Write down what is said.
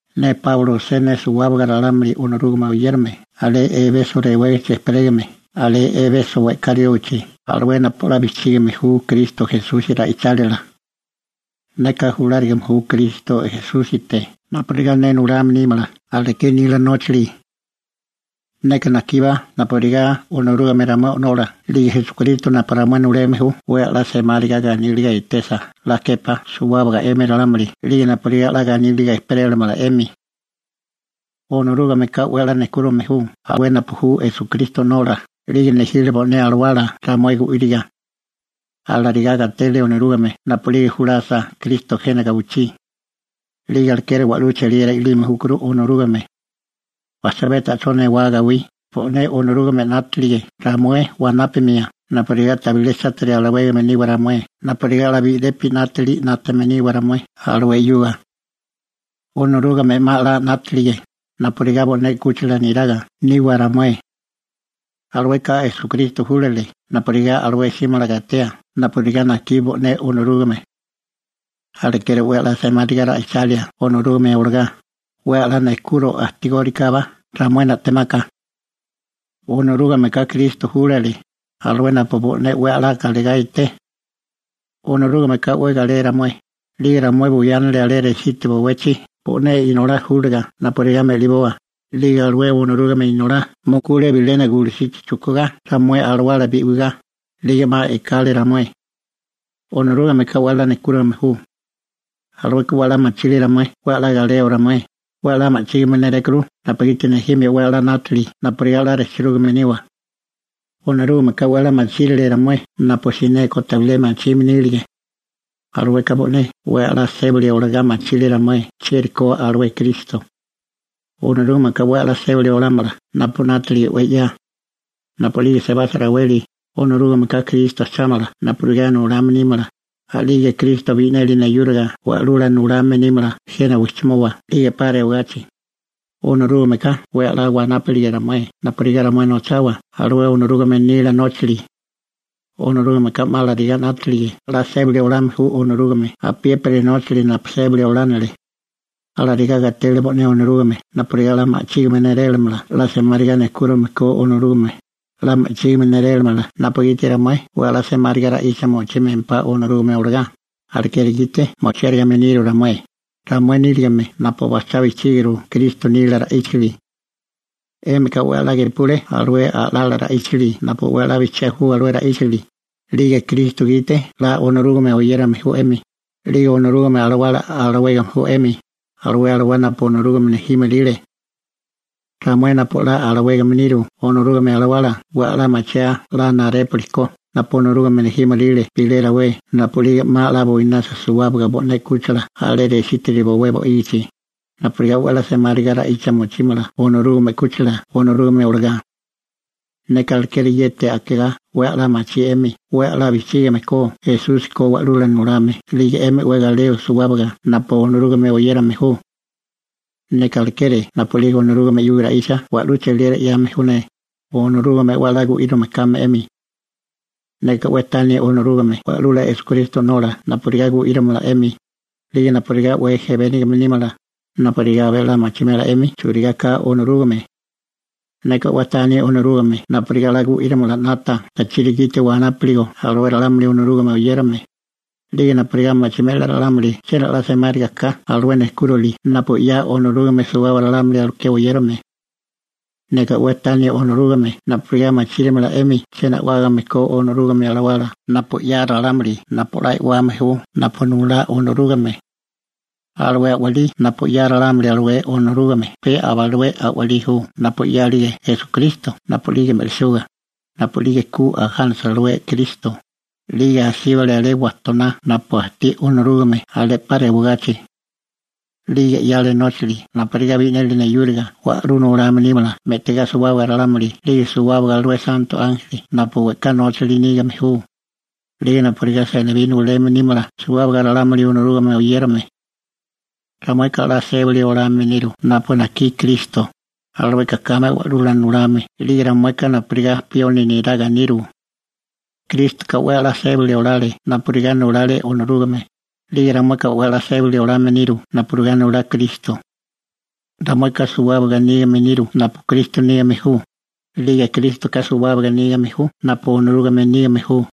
Ne Páulo osé ne suwábaga ralámuli Onorúgame oyérame alé Ebeso rewégichi ejperégame, alé Ebeso we'ká riógichi, alué napu 'la bijchígime ju Kristo Esusi ra'ichálila. Neka julárigame ju Kristo Esúsite napurigá ne nulame nímala aleké nila nóchali. Neka najkíbá napurigá Onorúgame ramué o'nola 'lige Esukristo napu ramué nuleme ju 'we 'la semáriga ganíliga etesa 'la képá suwábaga 'emi ralámuli, 'lige napurigá 'la ganíliga ejperélamala 'emi. Onorúgameka 'we a'lá nejkúrame ju, alué napu ju Esukristo O'nola, 'lige nejile bo'né alawala ramué gu'íriga. Alarigá gatele Onorúgame napu'lige julasa Kristo jena gawichí. 'Lige alekeri wa'lú cheliera i'lime júkuru Onorúgame. Bajchabé ta'chó newá gawí, bo'né Onorúgame 'nátalige ramué wanápamia napurigá tabilé chátiri alawégame niwa ramué napurigá 'la bi'lepi 'nátili 'nátame niwa ramué alué 'yuga. Onorúgame 'ma 'la 'nátalige napurigá bo'né 'kúchila niraga niwa ramué. Alueka Esukristo júlale napurigá alué 'símala gatea napurigá najkí bo'né Onorúgame. Alekeri 'we 'la semáriga ra'ichalia Onorúgame olagá, 'we 'la nejkuro ajtigórikábá ramué na'temaka. Onorúgameka Kristo júlale, alué napu bo'né 'we galegá eté. Onorúgameka 'we galé ramué, 'lige ramué buyánale alé resítiri bowechi bo'né Inolá júliga napurigá me'liboa, 'lige alué Onorúgame Inolá mukule bilena gulusichi chujkugá ramué alawala bi'wigá, 'lige 'ma e'kale ramué. Onorúgameka 'we 'la nejkúrime ju. Alueka 'we 'la machiri ramué 'we 'la galeo ramué, 'we 'la ma'chígime nérékuru napugiti nejime 'we 'la 'nátili napurigá 'la rejchirúgame niwa. Onorúgameka 'we 'la machírile ramué napu sineko tabilé machime nírige. Alueka bo'né 'we a'lá sébili olagá machiri ramué chieri ko alué Kristo. Onorúgameka 'we 'la sébali olámala napu 'nátalige 'we 'ya. Napu'lige sebasa raweli, Onorúgameka Kristo ajchámala napurigá nulame nímala, a'lige Kristo bi'neli neyúriga Wa'lula Nulame nímala jena wijchimoba 'lige 'pa rewagachi. Onorúgameka 'we 'la wanápalige ramué napurigá ramué nochawa alué Onorúgame nila nóchali. Onorúgameka 'ma alarigá 'nátalige 'la sébali olame ju Onorúgame apiépiri nóchali napu sébali olánili. Alarigá gatele bo'né Onorúgame napurigá 'la ma'chígime nélélamala 'la semáriga nejkúrime ko Onorúgame, 'la ma'chígime nélélamala napugiti ramué 'we 'la semáriga ra'icha mochímempá Onorúgame olagá, alekeri gite mochiárigime niru ramué, ramué nírigime napu bajchá bijchíguru Kristo nila ra'íchali. 'Émika 'we 'la gepule alué a'lala ra'íchali napu 'we 'la bijchiá ju alué ra'íchali, 'lige Kristo gite 'la Onorúgame oyérame ju 'emi, 'lige Onorúgame Alawala alawégame ju 'emi, alué alawá napu Onorúgame nejímoríle. Ramué napu 'la alawégame niru Onorúgame Alawala 'we 'la machiaa 'la narépuli ko napu Onorúgame nejímoríle bilé rawé napu'lige 'ma 'la buinasa suwábaga bo'né 'kúchila alé resítiri bowé bo'ígichi, napurigá 'we 'la semáriga ra'icha mochímala Onorúgame 'kúchila Onorúgame olagá. Neka alekeri yeti akegá 'we 'la machí 'emi 'we 'la bijchígame ko Esusi ko wa'lula nulame 'lige 'emi 'we galeo suwábaga napu Onorúgame oyérame ju. Neka alekeri napu'lige Onorúgame 'yuga ra'icha wa'lú cheliera 'yame ju ne, Onorúgame 'we 'la gu'írame kame 'emi. Neka 'we tani Onorúgame Wa'lula Esukristo O'nola napurigá gu'írimala 'emi, 'lige napurigá 'we ejebénigame nímala, napurigá abé 'la machimela 'emi churigá ka Onorúgame. Neka 'we tani Onorúgame napurigá 'la gu'írimala 'nata tachiri gite wanápuligo alué ralámuli Onorúgame oyérame, 'lige napurigá machimela ralámuli chiena 'la semáriga ka alué nejkúrali napu 'ya Onorúgame suwábaga ralámuli aleké oyérame. Neka 'we tani Onorúgame napurigá machírimala 'emi chiena a'wágame ko Onorúgame Alawala napu 'ya ralámuli napu 'la e'wame ju napu nulá Onorúgame. Alué a'walí napu 'ya ralámuli alué Onorúgame pe aba alué a'walí ju napu 'yálige Esukristo napu'lige me'lisuga, napu'lige ku ajánasa alué Kristo, 'lige asíbale alé wajtoná napu ajtí Onorúgame alé 'pa rewagachi. 'Lige 'yale nóchali napurigá bi'neli neyúriga Wa'lula Nulame nímala me'tigá suwábaga ralámuli 'lige suwábaga alué santo ánjeli napu we'ká nóchali nígame ju, 'lige napurigá senibí nuleme nímala suwábaga ralámuli Onorúgame oyérame. Ramueka 'la sébali olame niru napu najkí Kristo, alueka kame Wa'lula Nulame 'lige ramueka napurigá pioni neraga niru. Krístoka 'we 'la sébali olale napurigá nulale Onorúgame, 'lige ramueka 'we 'la sébali olame niru napurigá nulá Kristo. Ramueka suwábaga nígame niru napu Kristo nígame ju, 'lige Krístoka suwábaga nígame ju napu Onorúgame nígame ju.